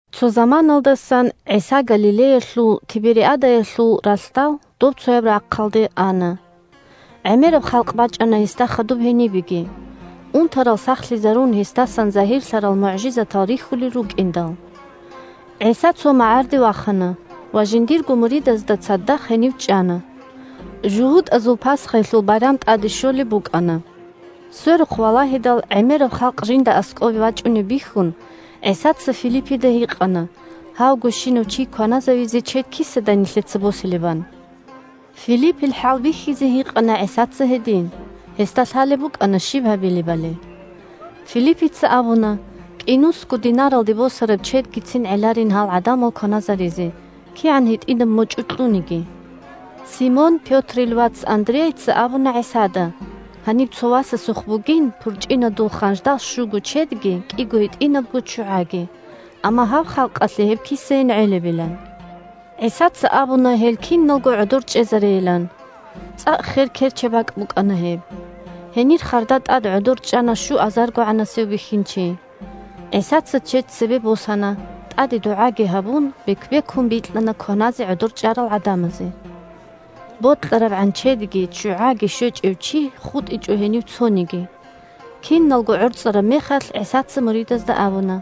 Цо заманаялдасан ГӀиса Галилеялъул (Тибериадаялъул) ралъдал добцояб рахъалде ана. ГӀемераб халкъ бачӀана гьесда хадуб гьенибеги, унтарал сахлъизарун гьесдасан загьирлъарал мугӀжизатал рихьулел рукӀиндал. ГӀиса цо магӀарде вахана ва жиндирго муридазда цадахъ гьенив чӀана. ЖугьутӀазул Пасхаялъул байрам тӀаде щолеб букӀана. Сверухъ валагьидал, гӀемераб халкъ жинда аскӀобе бачӀунеб бихьун, ГӀисаца Филиппида гьикъана гьавгощинав чи кваназавизе чед кисадай нилъеца босилебан. (Филиппил хӀалбихьизе гьикъана ГӀисаца гьедин. Гьесда лъалеб букӀана щиб гьабилебали.) Филиппица абуна кӀинусго динаралде босараб чедгицин гӀеларин гьал гӀадамал кваназаризе, кигӀан гьитӀинаб мочӀу кьуниги. Симон Пётрил вац Андрейица абуна ГӀисада гьаниб цо васасухъ бугин пурчӀинадул ханждал щуго чедги кӀиго гьитӀинабго ччугӀаги, амма гьаб халкъалъе гьеб кисайин гӀелебилан. ГӀисаца абуна гьел киналго гӀодор чӀезарейилан. ЦӀакъ хер керчаб бакӀ букӀана гьеб. Гьенир харда тӀад гӀодор чӀана щуазаргогӀанасев бихьинчи. ГӀисаца чед цебе босана, тӀаде дугӀаги гьабун, бек-бекун бикьана кваназе гӀодор чӀарал гӀадамазе. БокьарабгӀан чедги ччугӀаги щвечӀев чи хутӀичӀо гьенив цониги. Киналго гӀорцӀараб мехалъ, ГӀисаца муридазда абуна,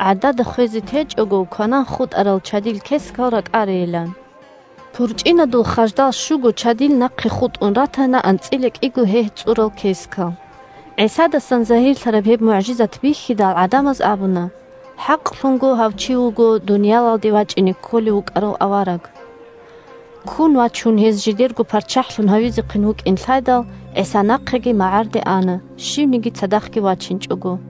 гӀадада хвезе течӀого, кванан хутӀарал чадил кескал ракӀарейилан. ПурчӀинадул ханждал щуго чадил нахъе хутӀун ратана анцӀила кӀиго гьегь цӀурал кескал. ГӀисадасан загьирлъараб гьеб мугӀжизат бихьидал, гӀадамаз абуна: – ХӀакълъунго гьав чи вуго дуниялалде вачӀине кколев вукӀарав авараг. Ккун вачун, гьез жидерго парччахӀлъун гьавизехъин вукӀин лъайдал, ГӀиса нахъеги магӀарде ана, щивниги цадахъги вачинчӀого.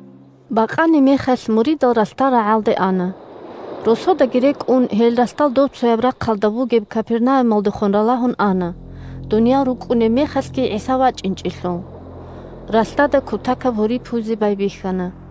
Бакъанимехалъ муридал ралъдал рагӀалде ана. Росодаги рекӀун, гьел ралъдал добцояб рахъалда бугеб Капернаумалдехун ралагьун ана, дуниял рукӀкӀунеб мехалъги ГӀиса вачӀинчӀелъул. Ралъдада кутакаб гьури пуйзе байбихьана.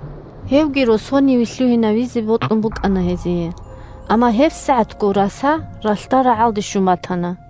Гьевги росониве лъугьинавизе бокьун букӀана гьезие, амма гьебсагӀатго раса ралъдал рагӀалде щун батана.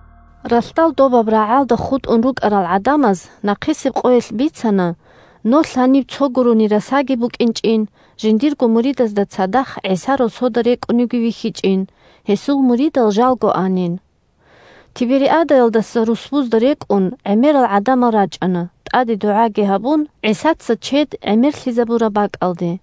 Ралъдал добаб рагӀалда хутӀун рукӀарал гӀадамаз нахъисеб къоялъ бицана, нолъ гьаниб цо гурони расаги букӀинчӀин, жиндирго муридазда цадахъ ГӀиса росода рекӀуневги вихьичӀин, гьесул муридал жалго анин. Тибериадаялдаса, русбузда рекӀун, гӀемерал гӀадамал рачӀана, тӀаде дугӀаги гьабун, ГӀисаца чед гӀемерлъизабураб бакӀалде.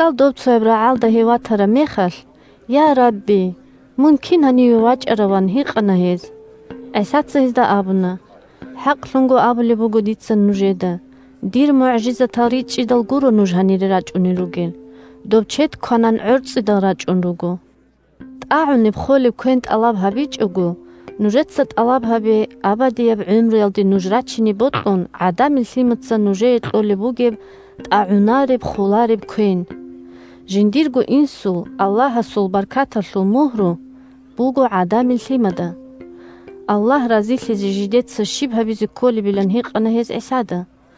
Ралъдал добцояб рагӀалда гьев ватараб мехалъ: – Я, Рабби, мун кин гьаниве вачӀарав? – ан гьикъана гьез. ГӀисаца гьезда абуна: – ХӀакълъун абулеб буго дица нужеда: дир мугӀжизатал ричӀчӀидал гуро нуж гьанире рачӀун ругел, доб чед кванан, гӀорцӀидал рачӀун руго. ТӀагӀунеб-холеб квен тӀалаб гьабичӀого, нужеца тӀалаб гьабе абадияб гӀумруялде нуж рачине бокьун ГӀадамил Лъимаца нужее кьолеб бугеб тӀагӀунареб-холареб квен. Жиндирго Инсул – Аллагьасул баркаталъул мугьру буго ГӀадамил Лъимада. Аллагь разилъизе жидеца щиб гьабизе кколебилан гьикъана гьез ГӀисада.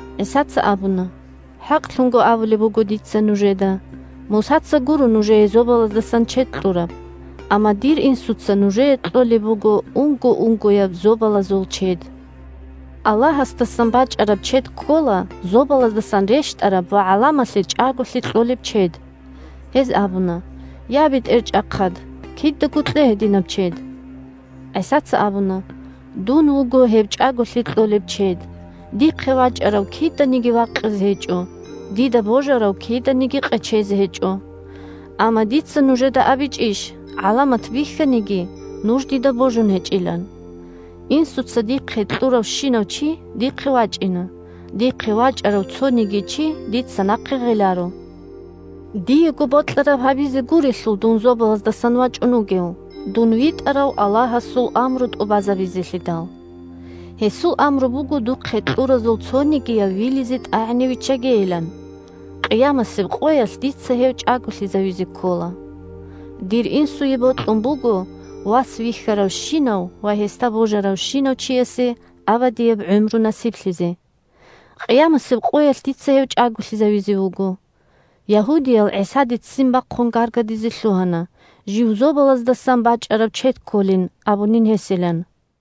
ГӀисаца абуна: – ХӀакълъун абулеб буго дица нужеда: Мусаца гуро нужее зобалаздасан чед кьураб, амма дир Инсуца нужее кьолеб буго унго-унгояб зобалазулаб чед. Аллагьасдасан бачӀараб чед ккола зобалаздасан рещтӀараб ва гӀаламалъе чӀаголъи кьолеб чед. Гьез абуна: – Я, БетӀерчӀахъад, кидаго кье гьединаб чед. ГӀисаца абуна: – Дун вуго гьеб чӀаголъи кьолеб чед. Дихъе вачӀарав киданиги вакъизе гьечӀо, дида божарав киданиги къечезе гьечӀо. Амма дица нужеда абичӀищ, гӀаламат бихьаниги, нуж дида божун гьечӀилан. Инсуца дихъе кьуравщинав чи дихъе вачӀина, дихъе вачӀарав цониги чи дица нахъе гъеларо. Диего бокьараб гьабизе гурелъул дун зобалаздасан вачӀун вугев, дун витӀарав Аллагьасул амру тӀубазабизелъидал. Гьесул амру буго духъе кьуразул цонигияв вилизе-тӀагӀине виччагейилан. Къиямасеб къоялъ дица гьев чӀаголъизавизе ккола. Дир Инсуе бокьун буго Вас вихьаравщинав ва гьесда божаравщинав чиясе абадияб гӀумру насиблъизе. Къиямасеб къоялъ дица гьев чӀаголъизавизе вуго. Ягьудиял ГӀисаде ццин бахъун гаргадизе лъугьана жив зобалаздасан бачӀараб чед кколин абунин гьесилан.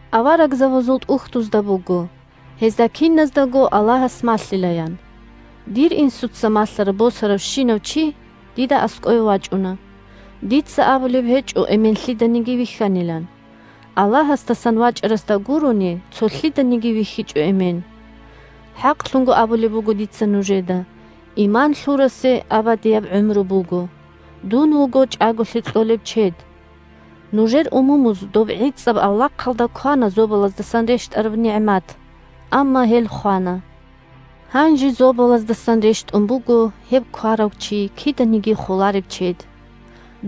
Аварагзабазул ТӀухьдузда буго: «Гьезда киназдаго Аллагьас малъила», – ян. Дир Инсуца малъараб босаравщинав чи дида аскӀове вачӀуна. Дица абулеб гьечӀо Эмен лъиданиги вихьанилан. Аллагьасдасан вачӀарасда гурони, цо лъиданиги вихьичӀо Эмен. ХӀакълъун абулеб буго дица нужеда: иман лъурасе абадияб гӀумру буго. Дун вуго чӀаголъи кьолеб чед. Нужер умумуз доб гӀицӀаб авлахъалда квана зобалаздасан рещтӀараб нигӀмат, амма гьел хвана. Гьанже зобалаздасан рещтӀун буго гьеб кварав чи киданиги холареб чед.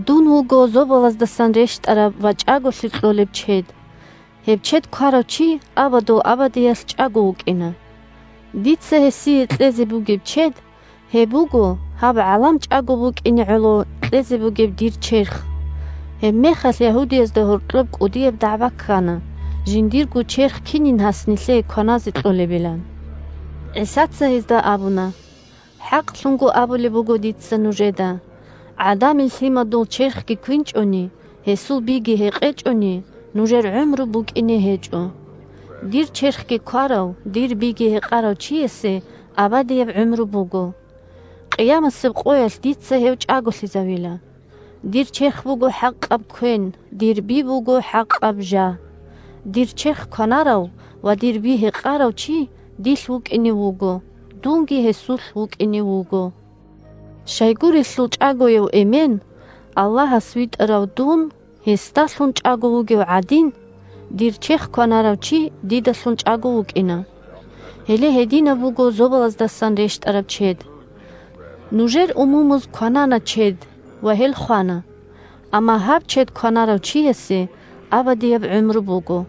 Дун вуго зобалаздасан рещтӀараб ва чӀаголъи кьолеб чед. Гьеб чед кварав чи абадул абадиялъ чӀаго вукӀина. Дица гьесие кьезе бугеб чед – гьеб буго гьаб гӀалам чӀаго букӀине гӀоло кьезе бугеб дир Черх. Гьебмехалъ ягьудиязда гьоркьоб кӀудияб дагӀба ккана жиндирго черх кинин гьас нилъее кваназе кьолебилан. ГӀисаца гьезда абуна: – ХӀакълъун абулеб буго дица нужеда: ГӀадамил Лъимадул Черхги квинчӀони, гьесул Биги гьекъечӀони, нужер гӀумру букӀине гьечӀо. Дир Черхги кварав, дир Биги гьекъарав чиясе абадияб гӀумру буго. Къиямасеб къоялъ дица гьев чӀаголъизавила. Дир Черх буго хӀакъаб квен, дир Би буго хӀакъаб жа. Дир Черх кванарав ва дир Би гьекъарав чи дилъ вукӀине вуго, дунги гьесулъ вукӀине вуго. Щайгурелъул ЧӀагояв Эмен – Аллагьас витӀарав дун гьесдалъун чӀаго вугев гӀадин, дир Черх кванарав чи дидалъун чӀаго вукӀина. Гьеле гьединаб буго зобалаздасан рещтӀараб чед. Нужер умумуз кванана чед ва гьел хвана. Амма гьаб чед кванарав чиясе абадияб гӀумру буго.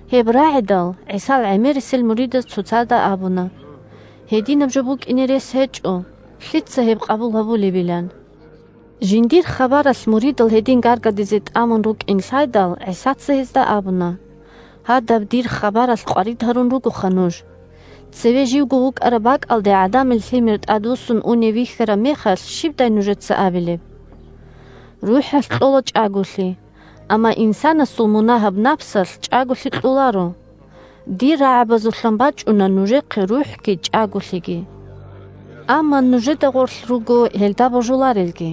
Гьеб рагӀидал, ГӀисал гӀемерисел муридаз цоцазда абуна: – Гьединаб жо букӀине рес гьечӀо! Лъица гьеб къабул гьабилеб? – ан. Жиндир хабаралъ муридал гьедин гаргадизе тӀамун рукӀин лъайдал, ГӀисаца гьезда абуна: – Гьадаб дир хабаралъ къварид гьарун ругоха нуж. Цеве живго вукӀараб бакӀалде ГӀадамил Лъимер тӀадвуссун унев вихьараб мехалъ щибдай нужеца абилеб? РухӀалъ кьола чӀаголъи. Амма инсанасул мунагьаб напсалъ чӀаголъи кьоларо. Дир рагӀабазулъан бачӀуна нужехъе рухӀги чӀаголъиги. Амма нужеда гъорлъ руго гьелда божуларелги.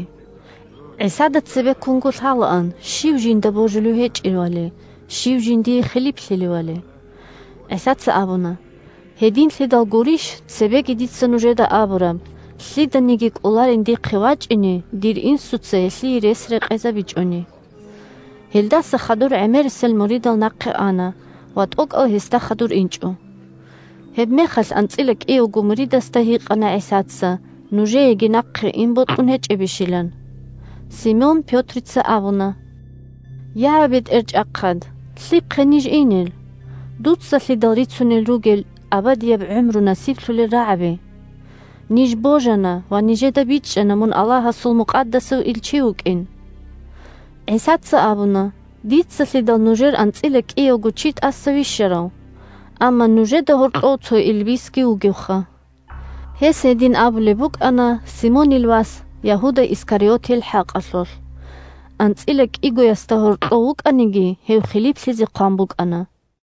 (ГӀисада цебеккунго лъалаан щив жинда божулев гьечӀевали, щив жиндие хилиплъилевали.) ГӀисаца абуна: – Гьединлъидал гурищ цебеги дица нужеда абураб, лъиданиги кӀоларин дихъе вачӀине, дир Инсуца гьелъие рес рекъезабичӀони. Гьелдаса хадур гӀемерисел муридал нахъе ана ва тӀокӀал гьесда хадур инчӀо. Гьебмехалъ анцӀила кӀиявго муридасда гьикъана ГӀисаца нужееги нахъе ине бокьун гьечӀебищилан. Симон Пётрица абуна: – Я, БетӀерчӀахъад, лъихъе ниж инел? Дуцалъидал рицунел ругел абадияб гӀумру насиблъулел рагӀаби. Ниж божана ва нижеда бичӀчӀана мун Аллагьасул мукъадасав илчи вукӀин. ГӀисаца абуна: – Дицалъидал нужер анцӀила кӀиявго чи тӀаса вищарав. Амма нужеда гьоркьов цо илбисги вугевха! Гьес гьедин абулеб букӀана Симонил вас Ягьуда Искариотил хӀакъалъулъ. АнцӀила кӀигоясда гьоркьов вукӀаниги, гьев хилиплъизе хъван букӀана.